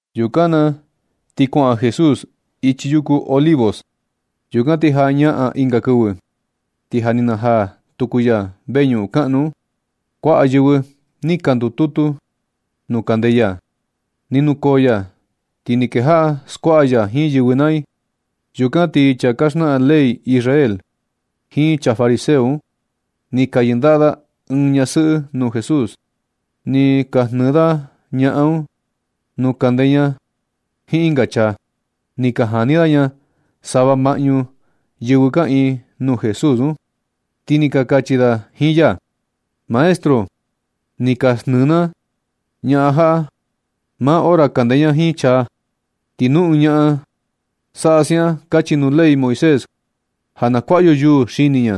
Yukan na ti kuaꞌa Jesús ichi yuku Olivos. Yukan ti jañaꞌan ɨnga kɨvɨ, ti ja ni najaa tuku ya veñuꞌun kaꞌnu un. Kuaꞌa yɨvɨ ni ka ndututu tuku nuu kande ya. Ni nukoo ya ti ni kejaꞌa skuaꞌa ya jiin yɨvɨ naa i. Yukan ti chaa ka xnaꞌan ley Israel jiin chaa fariseo un, ni ka yɨndaꞌa da ɨɨn ñasɨꞌɨ nuu Jesús. Ni ka jnɨɨ da ñaꞌan un nuu kande ña jiin ɨnga chaa. Ni ka jani da ña sava maꞌñu yɨvɨ kaꞌiin nuu Jesús un, ti ni ka kachi da jiin ya: ―Maestro, ni ka jnɨɨ na ña jaꞌa maa hora kande ña jiin chaa. Ti nu ɨɨn ñaꞌan saꞌa siaꞌan kachi nuu ley Moisés ja na kuaꞌa yo yuu xini ña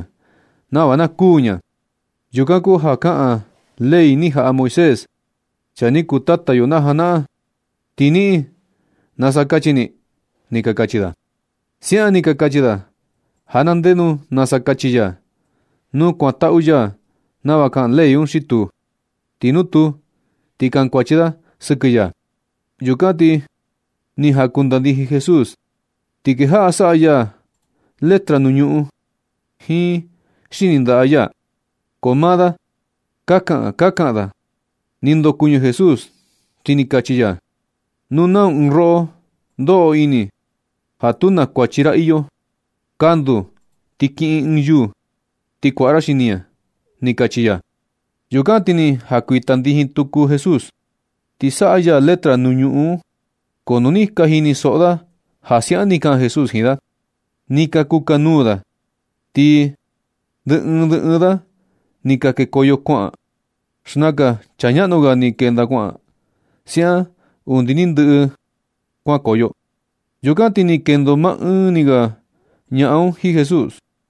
nava na kuū ña. Yukan kuu ja kaꞌan ley ni jaꞌa Moisés, chaa ni kuu tata yo na janaꞌan. Ti niꞌin, ¿nasa kachi ni? ―ni ka kachi da. Siaꞌan ni ka kachi da ja na ndenu nasa kachi ya, nu kuantaꞌu ya nava kaꞌan ley un xi tuu. Ti nu tuu, ti kankuachi da sɨkɨ ya. Yukan ti ni jankuitandijin Jesús, ti kejaꞌa saꞌa ya letra nuu ñuꞌun jiin xini ndaꞌa ya. Ko maa da ka kaꞌan ka kaꞌan da. Ni ndokuɨñɨ Jesús, ti ni kachi ya: ―Nuu nau ɨɨn roꞌo ndoꞌo ini ja tu na kuachi ra iyo, kanduu ti kiꞌin ɨɨn yuu ti kuaꞌa ra xini ña ―ni kachi ya. Yukan ti ni jankuitandijin tuku Jesús, ti saꞌa ya letra nuu ñuꞌun un. Ko nu ni ka jinisoꞌo da ja siaꞌan ni kaꞌan Jesús jiin da, ni ka kukanuu da, ti ndɨ ɨɨn ndɨ ɨɨn da ni ka kekoyo kuaꞌan. Xnakan chaa ñaꞌnu ga ni kenda kuaꞌan, siaꞌan undi ni ndɨꞌɨ da kuankoyo. Yukan ti ni kendo ma ɨɨn ni ga ñaꞌan un jiin Jesús.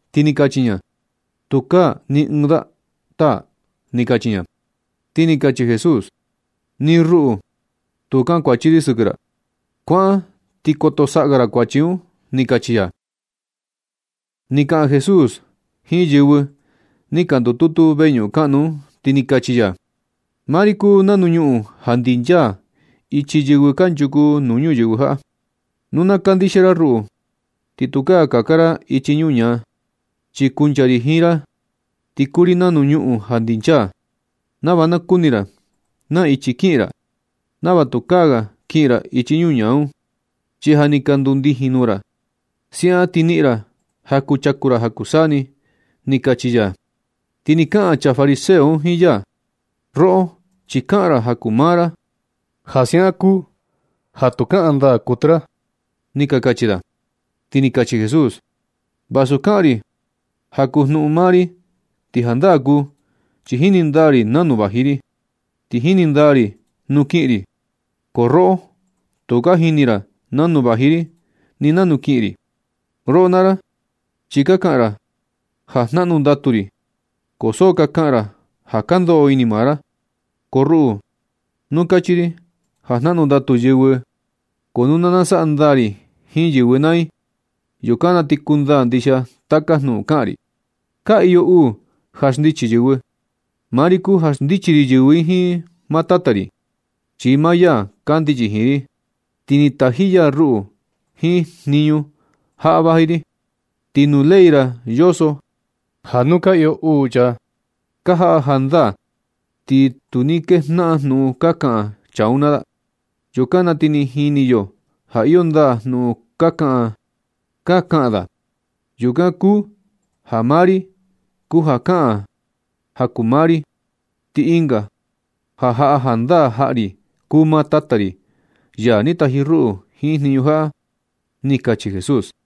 Ti ni kachi ña: ―Tukaa ni ɨɨn da, taa ―ni kachi ña. Ti ni kachi Jesús: ―Ni ruꞌu tu kuu kankuachi ri sɨkɨ ra. Kuaꞌan ti koto saꞌa ga ra kuachi un ―ni kachi ya. Ni kaꞌan tuku Jesús jiin yɨvɨ ni ka ndututu veñuꞌun kaꞌnu un, ti ni kachi ya: ―Maa ri kuu nanu ñuꞌun ja ndinchaa ichi yɨvɨ kanchuku nuu ñuyɨvɨ jaꞌa. Nu na kandixia ra ruꞌu, ti tukaa kaka ra ichi ñuñaa. Chi kuncha ri jiin ra, ti kuu ri nanu ñuꞌun ja ndinchaa, nava na kuni ra na ichi kiꞌin ra. Nava tukaa ga kiꞌin ra ichi ñuñaa un, chi ja ni ka ndundijin nuu ra. Siaꞌan ti niꞌin ra ja kuchaku ra ja kuu saa ni ―ni kachi ya. Ti ni ka kaꞌan chaa fariseo un jiin ya: ―Roꞌo, chi kaꞌan ra ja kuu maa ra. Ja siaꞌan kuu ja tu kaꞌan ndaa kuɨtɨ ra ―ni ka kachi da. Ti ni kachi Jesús: ―Vasu kaꞌan ri ja kuu jnuꞌun maa ri, ti jandaa kuu, chi jini ndaa ri nanu vaji ri, ti jini ndaa ri nuu kiꞌin ri. Ko roꞌo, tu ka jini ra nanu vaji ri ti ni nanu kiꞌin ri. Roꞌo naa ra, chi ka kaꞌan ra ja jnaꞌnu ndatu ri, ko so ka kaꞌan ra ja ka ndoꞌo ini maa ra. Ko ruꞌu, nu kachi ri ja jnaꞌnu ndatu yɨvɨ. Ko nu na nasaꞌa ndaa ri jiin yɨvɨ naa i, yukan na ti kundaa ndixia taka jnuꞌun kaꞌan ri. Ka iyo uu ja xndichi yɨvɨ. Maa ri kuu ja xndichi ri yɨvɨ jiin maa Tata ri, chi maa ya kandichi jiin ri, ti ni taji ya ruꞌu jiin jniñu jaꞌa vaji ri. Ti nu ley ra yoso ja nu ka iyo uu chaa ka jaꞌa jandaa, ti nu ni kejnaꞌan jnuꞌun ka kaꞌan chaa un naa da. Yukan na ti ni jini yo ja iyo ndaa jnuꞌun kaꞌan ka kaꞌan da. Yukan kuu ja maa ni ri kuu ja kaꞌan ja kuu maa ri. Ti ɨnga ja jaꞌa jandaa jaꞌa ri kuu maa Tata ri, ya ni taji ruꞌu jiin jniñu jaꞌa―ni kachi Jesús.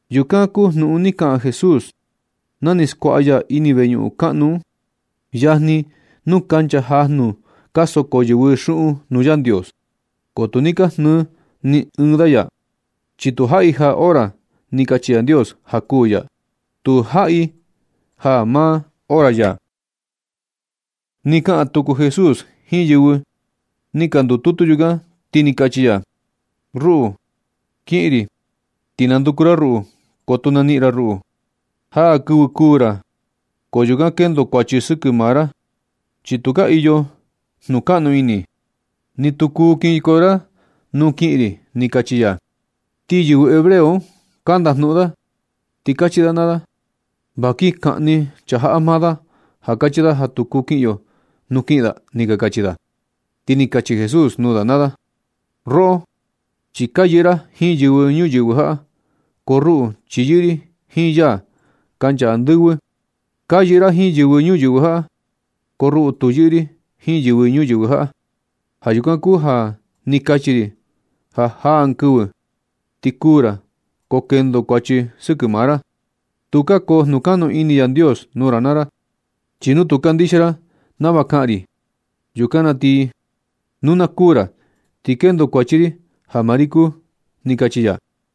Yukan kuu jnuꞌun ni kaꞌan Jesús na ni skuaꞌa ya ini veñuꞌun kaꞌnu un, yajni nuu kancha jajnu ka soko yɨvɨ xuꞌun nuu Yandios. Ko tu ni ka jnɨɨ ni ɨɨn da ya, chi tu jaꞌi jaa hora ni kachi Yandios ja kuū ya. Tu jaꞌi jaa maa hora ya. Ni kaꞌan tuku Jesús jiin yɨvɨ ni ka ndututu yukan, ti ni kachi ya: ―Ruꞌu, kiꞌin ri ti nanduku ra ruꞌu, ko tu naniꞌin ra ruꞌu. Jaa kɨvɨ kuū ra, ko yukan kendo kuachi sɨkɨ maa ra. Chi tukaa iyo jnukaꞌnu ini, ni tu kuu kinkoyo ra nuu kiꞌin ri ―ni kachi ya. Ti yɨvɨ hebreo un ka ndajnuꞌun da ti kachi da naa da: ―Va kin kaꞌni chaa jaꞌa maa da ja kachi da ja tu kuu kiꞌin yo nuu kiꞌin da ―ni ka kachi da. Ti ni kachi Jesús nuu da naa da: ―Roꞌo chi ka yɨꞌɨ ra jiin yɨvɨ ñuyɨvɨ jaꞌa. Ko ruꞌu chi yɨꞌɨ ri jiin ya kancha andɨvɨ. Ka yɨꞌɨ ra jiin yɨvɨ ñuyɨvɨ jaꞌa. Ko ruꞌu tu yɨꞌɨ ri jiin ñuyɨvɨ jaꞌa. Ja yukan kuu ja ni kachi ri ja jaa ɨɨn kɨvɨ ti kuū ra, ko kendo kuachi sɨkɨ maa ra. Tukaa koo jnukaꞌnu ini Yandios nuu ra naa ra. Chi nu tu kandixia ra nava kaꞌan ri, yukan na ti nu na kuū ra ti kendo kuachi ri ja maa ri kuu ―ni kachi ya.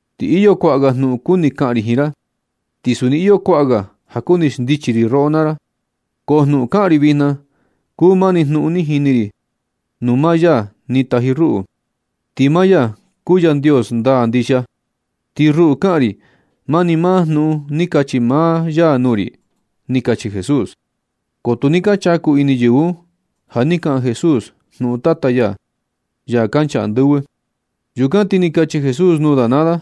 Ti iyo kuaꞌa ga jnuꞌun kuni kaꞌan ri jiin ra, ti suni iyo kuaꞌa ga ja kuni xndichi ri roꞌo naa ra. Ko jnuꞌun kaꞌan ri vijna kuu mani jnuꞌun ni jini ri nuu maa ya ni taji ruꞌu. Ti maa ya kuu Yandios ndaa ndixia. Ti ruꞌu, kaꞌan ri mani maa jnuꞌun ni kachi maa ya nuu ri ―ni kachi Jesús. Ko tu ni ka chaku ini yɨvɨ un ja ni kaꞌan Jesús jnuꞌun Tata ya, ya kancha andɨvɨ. Yukan ti ni kachi Jesús nuu da naa da: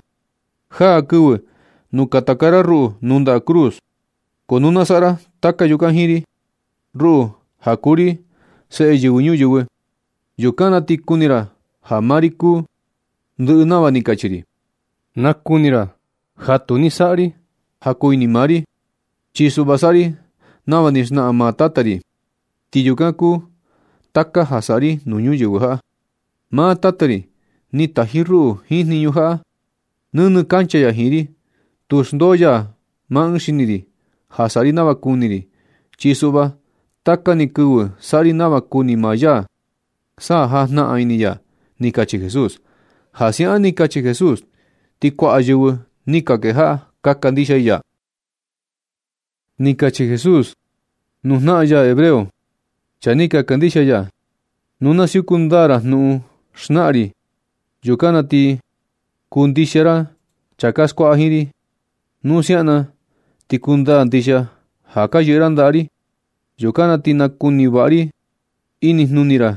―Jaa kɨvɨ nu katakaa ra ruꞌu nuu ndaꞌa cruz, ko nu na saꞌa ra taka yukan jiin ri, ruꞌu ja kuu ri Seꞌe Yɨvɨ Ñuyɨvɨ, yukan na ti kuni ra ja maa ri kuu ndɨꞌɨ nava ni kachi ri. Nakuni ra ja tu ni saꞌa ri ja kuu ini maa ri. Chi suꞌva saꞌa ri nava ni xnaꞌan maa Tata ri, ti yukan kuu taka ja saꞌa ri nuu ñuyɨvɨ jaꞌa. Maa Tata ri ni taji ruꞌu jiin jniñu jaꞌa. Nɨnɨ kancha ya jiin ri. Tu xndoo ya maa ɨɨn xini ri ja saꞌa ri nava kuni ri. Chi suꞌva taka ni kɨvɨ saꞌa ri nava kuni maa ya sa jajnaꞌan ini ya ―ni kachi Jesús. Ja siaꞌan ni kachi Jesús, ti kuaꞌa yɨvɨ ni ka kejaꞌa ka kandixia i ya. Ni kachi Jesús nuu jnaꞌan ya hebreo, chaa ni ka kandixia ya: ―Nu na siuku ndaa ra jnuꞌun xnaꞌan ri, yukan na ti ka kuu ndixia ra chaa ka skuaꞌa jiin ri. Nu siaꞌan na ti ni kundaa ndixia ja ka yɨꞌɨ ra ndaꞌa ri. Yukan na ti nakuni vaꞌa ini jnuni ra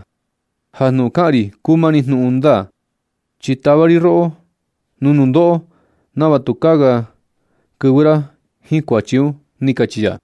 ja jnuꞌun kaꞌan ri kuu mani jnuꞌun ndaa. Chi natava ri roꞌo nuu nundoꞌo nava tukaa ga kɨvɨ ra jiin kuachi un ―ni kachi ya.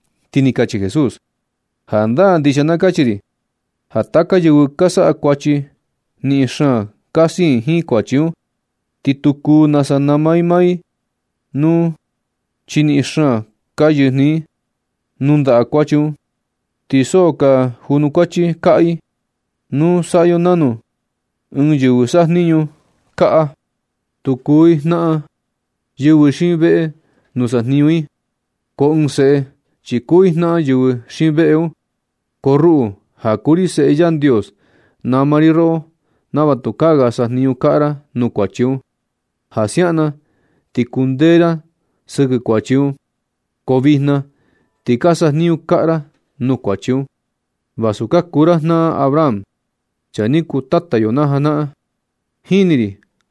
Ti ni kachi Jesús: ―Jandaa ndixia na kachi ri ja taka yɨvɨ ka saꞌa kuachi, niꞌin xaan ka siin jiin kuachi un, ti tu kuu nasa nama i maa i nuu, chi niꞌin xaan ka yɨjnɨ i nuu ndaꞌa kuachi un, ti so ka junukuachi kaꞌa i nuu. Saꞌa yo nanu, ɨɨn yɨvɨ sajniñu kaꞌa, tu kuu i jnaꞌan yɨvɨ xiin veꞌe nuu sajniñu i un. Ko ɨɨn seꞌe, chi kuu i jnaꞌan yɨvɨ xiin veꞌe un. Ko ruꞌu ja kuu ri Seꞌe Yandios, nama ri roꞌo nava tukaa ga sajniñu kaꞌa ra nuu kuachi un, ja siaꞌan na ti kundee ra sɨkɨ kuachi un. Ko vijna ti ka sajniñu kaꞌa ra nuu kuachi un, vasu ka kuu ra jnaꞌan Abraham, chaa ni kuu tata yo na janaꞌan. Jini ri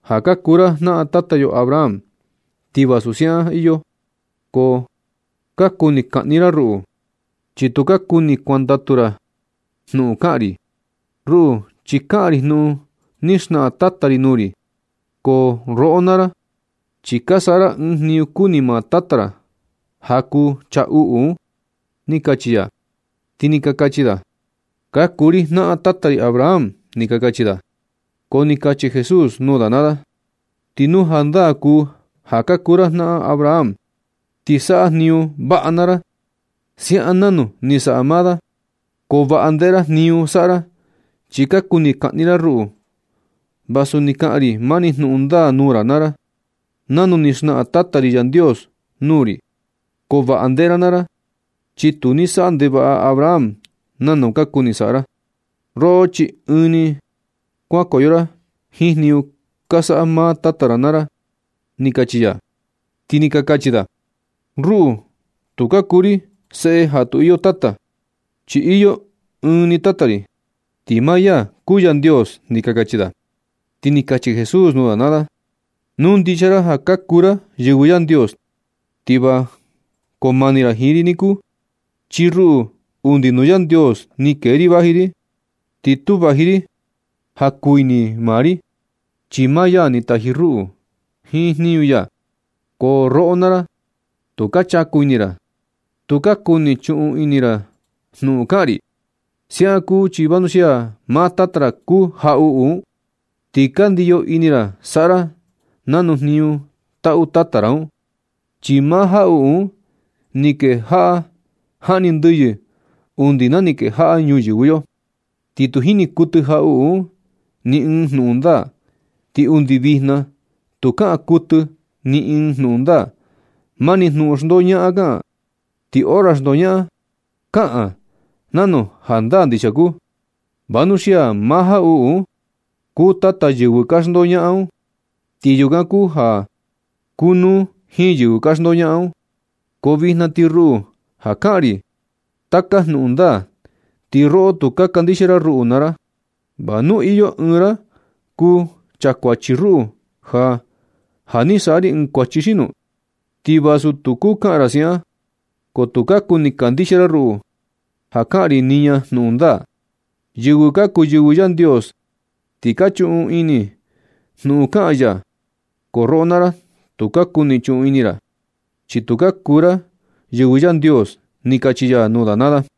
ja ka kuu ra jnaꞌan tata yo Abraham, ti vasu siaꞌan iyo, ko ka kuni kaꞌni ra ruꞌu, chi tu ka kuni kuantaꞌu ra jnuꞌun kaꞌan ri. Ruꞌu, chi kaꞌan ri jnuꞌun ni xnaꞌan Tata ri nuu ri. Ko roꞌo naa ra, chi ka saꞌa ra ɨɨn jniñu kuni maa tata ra, ja kuu chaa uꞌu un ―ni kachi ya. Ti ni ka kachi da: ―Ka kuu ri jnaꞌan tata ri Abraham ―ni ka kachi da. Ko ni kachi Jesús nuu da naa da: Ti nu jandaa kuu ja ka kuu ra jnaꞌan Abraham, ti saꞌa jniñu vaꞌa naa ra, siaꞌan nanu ni saꞌa maa da. Ko vaꞌa ndeꞌe ra jniñu saꞌa ra, chi ka kuni kaꞌni ra ruꞌu, vasu ni kaꞌan ri mani jnuꞌun ndaa nuu ra naa ra, nanu ni xnaꞌan Tata ri Yandios nuu ri. Ko vaꞌa ndeꞌe ra naa ra, chi tu ni saꞌa ndevaꞌa Abraham nanu ka kuni saꞌa ra. Roꞌo chi ɨɨn ni kuankoyo ra jiin jniñu ka saꞌa maa tata ra naa da ―ni kachi ya. Ti ni ka kachi da: ―Ruꞌu, tu ka kuu ri seꞌe ja tu iyo tata, chi iyo ɨɨn ni tata ri, ti maa ya kuu Yandios ―ni ka kachi da. Ti ni kachi Jesús nuu da naa da: ―Nu ndixia ra ja ka kuu ra yɨvɨ Yandios, ti va koo mani ra jiin ri niku. Chi ruꞌu, undi nuu Yandios ni kee ri vaji ri. Ti tu vaji ri ja kuu ini maa ri, chi maa ya ni taji ruꞌu jiin jniñu ya. Ko roꞌo naa ra, tu ka chaku ini ra. Tu ka kuni chuꞌun ini ra jnuꞌun kaꞌan ri. Siaꞌan kuu chi vanuxia maa tata ra kuu jaꞌuꞌu un, ti ka ndiyo ini ra saꞌa ra nau jniñu taꞌu tata ra un. Chi maa jaꞌuꞌu un ni kejaꞌa jaꞌni ndɨyɨ undi na ni kejaꞌa ñuyɨvɨ yo. Ti tu jini kuɨtɨ jaꞌuꞌu un ni ɨɨn jnuꞌun ndaa. Ni undi vijna tu kaꞌan kuɨtɨ ni ɨɨn jnuꞌun ndaa. Mani jnuꞌun xndoñaꞌan kaꞌan. Ti hora xndoñaꞌan, kaꞌan nanu ja jandaa ndixia kuu, vanuxia maa jaꞌuꞌu un kuu tata yɨvɨ ka xndoñaꞌan un. Ti yukan kuu ja kunuu jiin yɨvɨ ka xndoñaꞌan un. Ko vijna ti ruꞌu ja kaꞌan ri taka jnuꞌun ndaa, ti roꞌo tu ka kandixia ra ruꞌu naa ra. ¿Va nu iyo ɨɨn ra kuu chakuachi ruꞌu ja ja ni saꞌa ri ɨɨn kuachi xino? Ti vasu tu kuu kaꞌan ra siaꞌan, ko tu ka kuni kandixia ra ruꞌu ja kaꞌan ri niña jnuꞌun ndaa. Yɨvɨ ka kuu yɨvɨ Yandios, ti ka chuꞌun ini i jnuꞌun kaꞌan ya. Ko roꞌo naa ra, tu ka kuni chuꞌun ini ra, chi tu ka kuu ra yɨvɨ Yandios ―ni kachi ya nuu da naa da.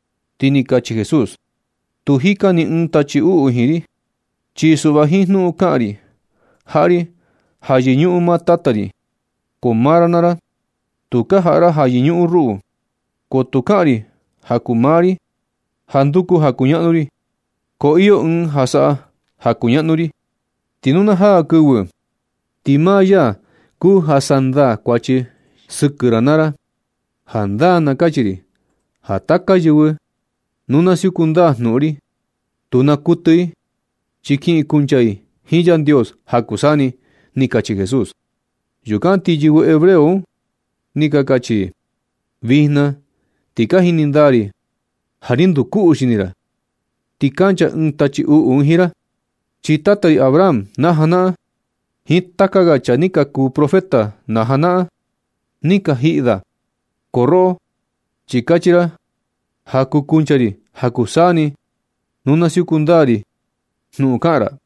Ti ni kachi Jesús: ―Tu jika ni ɨɨn tachi uꞌu jiin ri. Chi suꞌva jiin jnuꞌun kaꞌan ri, jaꞌa ri ja yɨñuꞌun nuu Tata ri. Ko maa ra naa ra, tu ka jaꞌa ra ja yɨñuꞌun ruꞌu. Ko tu kaꞌan ri ja kuu maa ri, ja nduku ja kuñaꞌnu ri. Ko iyo ɨɨn ja saꞌa ja kuñaꞌnu ri. Ti nu na jaa kɨvɨ, ti maa ya kuu ja sandaa kuachi sɨkɨ ra naa ra. Jandaa na kachi ri ja taka yɨvɨ nu na siuku ndaa jnuꞌun ri, tu naa kuɨtɨ i, chi kiꞌin i kuncha i jiin Yandios ja kuu saa ni ―ni kachi Jesús. Yukan ti yɨvɨ hebreo un ni ka kachi i: ―Vijna ti ka jini ndaa ri ja ni nduu kuꞌu xini ra, ti kancha ɨɨn tachi uꞌu jiin ra. Chi tata ri Abraham na janaꞌan, jiin taka ga chaa ni ka kuu profeta na janaꞌan un, ni ka jiꞌi da. Ko roꞌo, chi kachi ra ja kuu kuncha ri ja kuu saa ni nu na siuku ndaa ri jnuꞌun kaꞌan ra.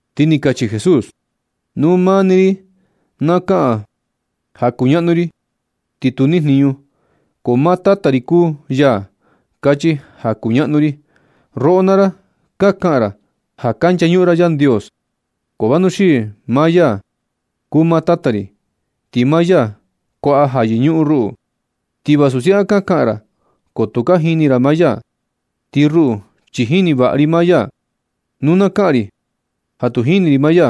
Ti ni kachi Jesús: ―Nu maa ni ri na kaꞌan ja kuñaꞌnu ri, ti tu nijniñu. Ko maa Tata ri kuu ya kachi ja kuñaꞌnu ri. Roꞌo naa ra, ka kaꞌan ra ja ka nchañuꞌun ra Yandios. Ko vanuxii maa ya kuu maa Tata ri, ti maa ya kuaꞌa ja yɨñuꞌun ruꞌu. Ti vasu siaꞌan ka kaꞌan ra, ko tu ka jini ra maa ya. Ti ruꞌu, chi jini vaꞌa ri maa ya. Nu na kaꞌan ri ja tu jini ri maa ya,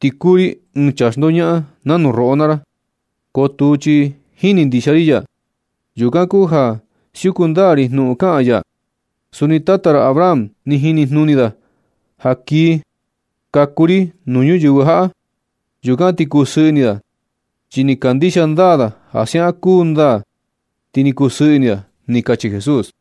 ti kuu ri ɨɨn chaa xndoñaꞌan nanu roꞌo naa ra. Ko tuu, chi jini ndixia ri ya. Yukan kuu ja siuku ndaa ri jnuꞌun kaꞌan ya. Suni tata ra Abraham, ni jini jnuni da ja kii kaku ri nuu ñuyɨvɨ jaꞌa. Yukan ti ni kusɨɨ ini da. Chi ni kandixia ndaa da ja siaꞌan kuu ndaa, ti ni kusɨɨ ini da ―ni kachi Jesús.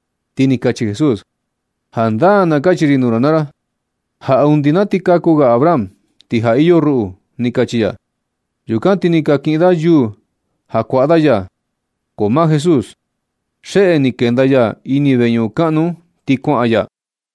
Ti ni kachi Jesús: ―Jandaa na kachi ri nuu ra naa ra ja undi na ti kaku ga Abraham, ti ja iyo ruꞌu ―ni kachi ya. Yukan ti ni ka kiꞌin da yuu ja kuaꞌa da ya. Ko maa Jesús, xeꞌe ni ni kenda ya ini veñuꞌun kaꞌnu un, ti kuaꞌan ni ya.